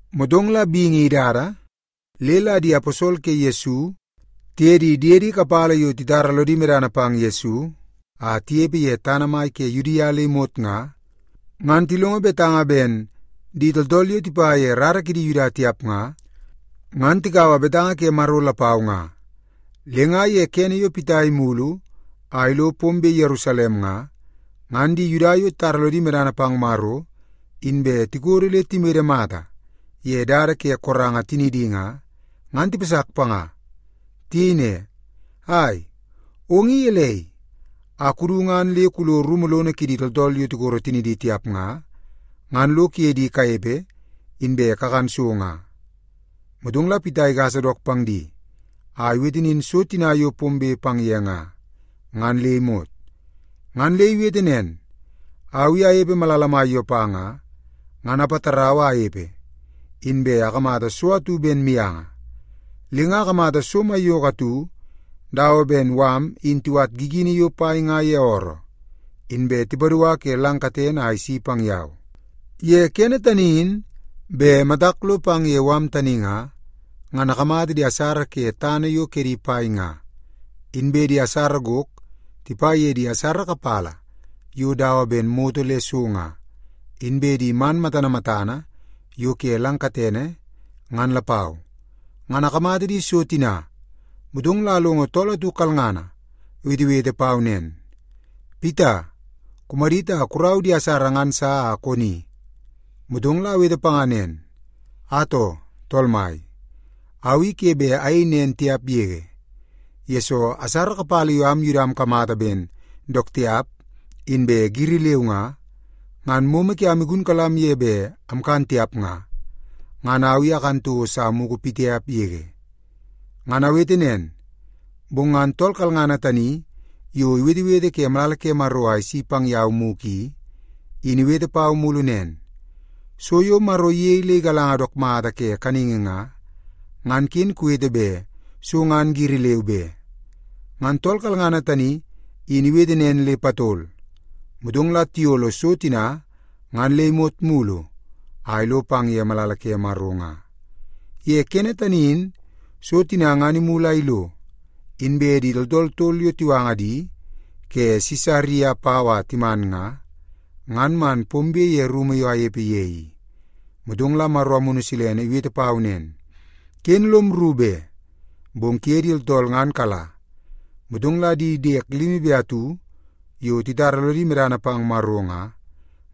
Motong la bingi idada le la di aposol ke Yesu tiye di diedi kapala yo titara lodi medana pang Yesu a tinepe ye tana mai ke Yudia le imot nga, ngan tilongo betanga ben di tooltool yo tipa ye rara kidi Yuda tiap nga, ngan tikaua betanga ke Maro lapau nga. Le nga ye kene yo Pita imulu a ilo pombe Yerusalem nga, ngan di Yuda yo titara lodi medana pang Maro inbe tikodo le timede mata ye dada ke koranga tinidi nga, ngan tipasak panga. Tiyei ne, “Ai, ong i gelei a kudu ngan le kulo rumu lono kidi tooltool yo tikoro tinidi tiap nga, ngan lo kuye di kanepe, inbe kakan so nga?” Motong la Pita igasa dook pang di a iwete nin so tina yo pombe pang ye nga, ngan le imot. Ngan le iwete nen, “Au i anepe malala mai Yopa nga, ngan apatarau a anepe, inbe akamata so atu ben mianga. Le nga akamata so maiyoko atu dawa ben mala in tiwat gigini yo pai nga ye ooroo, inbe tipadua ke lang katene a isi pang yau. Ye kene tani in bet matak lo pang ye mala tani nga, ngan akamata di asara ke tana yo kedi pai nga, inbe di asara gok tipa ye di asara kapala yo dawa ben moto le so nga, inbe di man matana matana yo ke lang katene, ngan lapau. Ngan akamata di so tina, motong la alongo tool atu kalngana iwetewete pau nen, ‘Pita, kumadit a kurau di asara ngan sa a koni.’ “Motong la awete panga nen, ‘Atoo, Tool Mai! Au i ke bet ayei nen tiap yege, yesoo asara kapala yo am Yuda amkamata ben dook tiap inbe giri leu nga, ngan momo kiam igunkalam ye bet amkan tiap nga, ngan au i akan toko sa mugu pitiap yege.’ “Ngan awete nen, bong ngan tool kalngana tani yo iwetewete ke malala ke Maro a isi pang yau mugu i, in iwete pau mulu nen, ‘So yo Maro iyei le igalanga dook mata ke kaningi nga, ngan ken kuwete bet so ngan giri leu be.’ Ngan tool kalngana tani in iwete nen le patol, motong la tiyolo so tina ngan le imot mulu a ilo pang ye malala ke Maro nga. “Ye kene tani in so tina ngan imulu a ilo, inbe di tooltool tol yo tiwanga di ke Sisaria pau a timan nga, ngan man pombe ye rumu yo amnepe ye i. Motong la Maro Amunu Silene iwete pau nen, ‘Ken lom rru be, bong kuye di tooltool ngan kala.’ Motong la di diek limi be atu yo titara lodi medana pang Maro nga,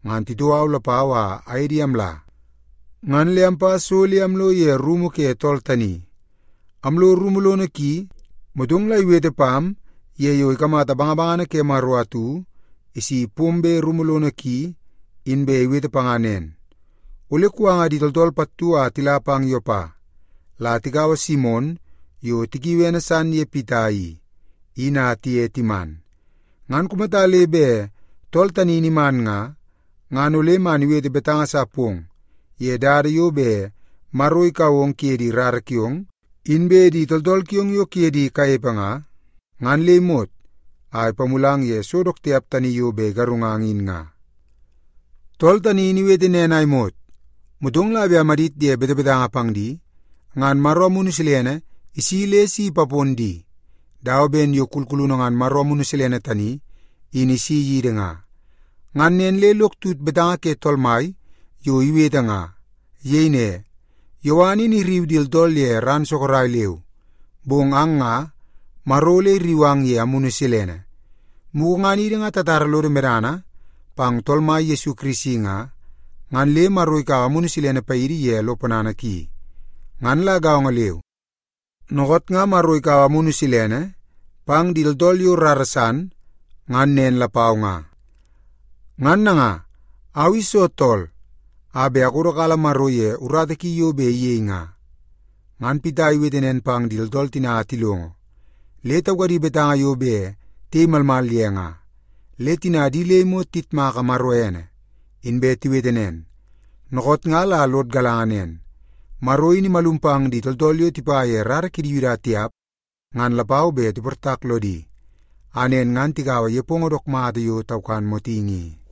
ngan titoo au lapau a aye di amla, ngan le ampa so le amlo ye rumu ke tool tani. Amlo rumu lono ki, motong la iwete pam ye yo ikamata bangabangana ke Maro atu isi pombe rumu lono ki, inbe iwete panga nen, ‘Ole kuwanga di tooltool pattu a tila pang Yopa, la tikaua Simon yo tikiui ene san ye Pita i, in a tiye timan. Ngan kumata le bet tool tani in iman nga, ngan ole man iwete betanga sa pong ye dada yo bet Maro ikau ong kuye di rara kiong, inbe di tooltool kiong yo kuye di kanepe nga, ngan le imot a ipamulang ye so dook tiap tani yo bet igarungang in nga.’ “Tool tani in iwete nen a imot, motong la bet amadit ye betebetanga pang di, ngan Maro Amunu Silene isi le si ipapon di, dawa ben yo kulkulunu ngan Maro Amunu Silene tani in isi yidi nga. Ngan nen le lok tut betanga ke Tool Mai yo iwete nga. Iyei ne, ‘Yowan in irriu di tooltool ye ran sorok leu, bong ang nga, Maro ole irriu ang ye Amunu Silene.’ Mugu ngan idi nga tatara lodo medana pang Tool Mai Yesu Kirisi nga, ngan le Maro ikaua Amunu Silene paidi ye lo ponana ki. Ngan la gaongo leu, dookoot nga Maro ikaua Amunu Silene pang di tooltool yo rara san, ngan nen lapau nga. Ngan nanga, au i soo tool a bet akodokala Maro ye urata ki yo bet iyei nga?” Ngan Pita iwete nen pang di tooltool tina a tilongo, le taukadi betanga yo bet tiyei malmal ye nga. Le tina di le imot tiyitmaka Maro ene, inbe tiwete nen, “Dookoot nga la lod galanga nen, Maro in imalum pang di tooltool yo tipa ye rara kidi Yuda tiap ngan lapau bet tiportak lodi, a nen ngan tikaua nepongo dook mata yo taukan motingi i.”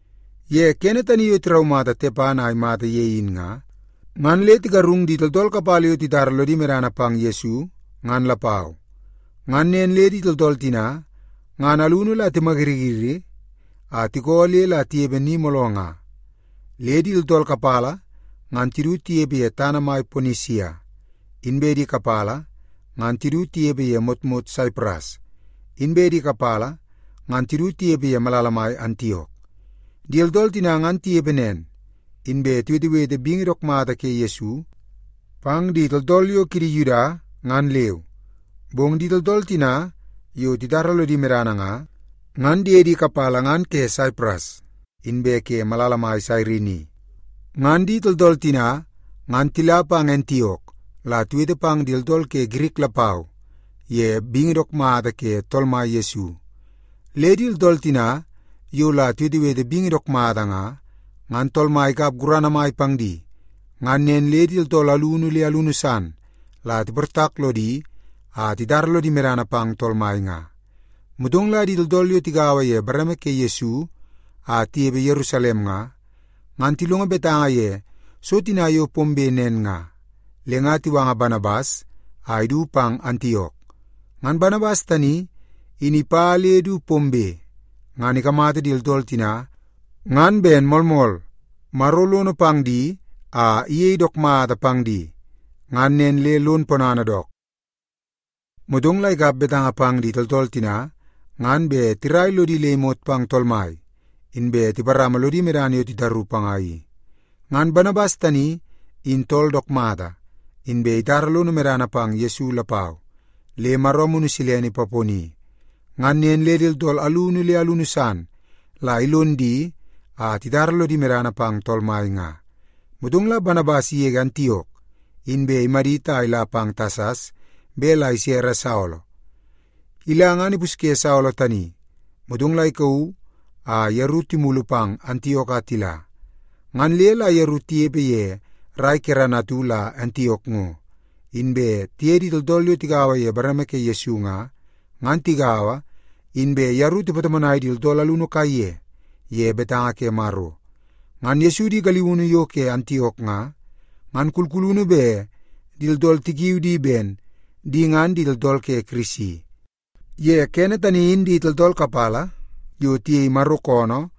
Ye kene tani yo tiraumata Tepan a imata ye in nga, ngan le tigarung di tooltool kapala yo titara lodi medana pang Yesu, ngan lapau. Ngan nen le di tooltool tina ngan alunu la timayiriyiri a tikoo le la tinepe ni mooloo nga. Le di tooltool kapala ngan tidu tinepe ye tana mai Ponisia, inbe di kapala ngan tidu tinepe ye motmot Saipras, inbe di kapala ngan tidu tinepe ye malala mai Antiok. Di tooltool tina ngan tinepe nen, inbe tiwetewete bingi dook mata ke Yesu pang di tooltool yo kidi Yuda, ngan leu. Bong di tooltool tina yo titara lodi medana nga, ngan diedi kapala ngan ke Saipras inbe ke malala mai Sairini. Ngan di tooltool tina ngan tila pang Antiok la tiwete pang di tooltool ke Girik lapau ye bingi dook mata ke Tool Mai Yesu. Le di tooltool tina yo la tiwetewete bingi dook mata nga, ngan Tool Mai ikap gurana mai pang di, ngan nen le di tooltool alunu le alunu san la tiportak lodi a titara lodi medana pang Tool Mai nga. Motong la di tooltool yo tigaua ye bareme ke Yesu a tinepe Yerusalem nga, ngan tilongo betanga ye so tina yo pombe nen nga, le nga tiwanga Banabas a idu pang Antiok. Ngan Banabas tani in ipa le du pombe, ngan ikamata di tooltool tina ngan ben moolmool Maro lono pang di a iyei dook mata pang di. Ngan nen le lon ponana dook. Motong la ikap betanga pang di tooltool tina ngan bet tirai lodi le imot pang Tool Mai, inbe tiparama lodi medana yo titaru panga i. Ngan Banabas tani in tool dook mata, inbe itara lono medana pang Yesu lapau, le Maro Amunu Silene ipaponi. Ngan nen le di tooltool alunu le alunu san la ilon di a titara lodi medana pang Tool Mai nga. Motong la Banabas igege Antiok, inbe imadit a ila pang Tasas bet la isere Saolo. Ila ngan ipusye Saolo tani, motong la ikauu a yeru timulu pang Antiok a tila. Ngan le la yeru tinepe ye rai kerana atu la Antiok ngo, inbe tiye di tooltool yo tigaua ye bareme ke Yesu nga, ngan tigaua, inbe yeru tipatomonai di tooltool alunu kaiye ye betanga ke Maro. Ngan Yesu di galiunu yo ke Antiok nga, ngan kulkulunu bet di tooltool tikiu di ben di ngan di tooltool ke Kirisi. Ye kene tani in di tooltool kapala yo tiyei Maro koonoo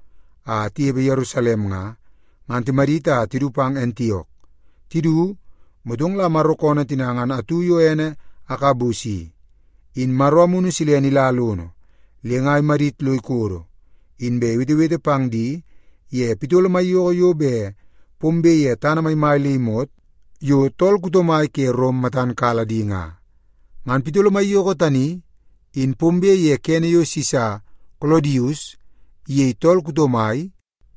a tinepe Yerusalem nga, ngan timadit a tidu pang Antiok. Tidu, motong la Maro koonoo tina ngan atu yo ene Agabus i, in Maro Amunu Silene ila lono le nga imadit lo ikodo, inbe iwetewete pang di ye pitolo maiyoko yo bet pombe ye tana maimai le imot yo tool kuto mai ke Rom matan kala di nga. (Ngan pitolo maiyoko tani in pombe ye kene yo Sisa Kolodius iyei tool kuto mai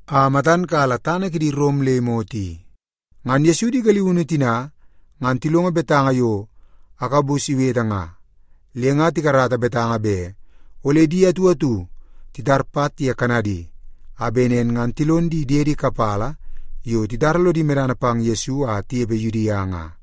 a matan kala tana kidi Rom le imot i.) Ngan Yesu di galiunu tina ngan tilongo betanga yo Agabus iwete nga, le nga tikarata betanga bet ole di atu atu titar pat ye kanadi, a bet nen ngan tilon di diedi kapala yo titara lodi medana pang Yesu a tinepe Yudia nga.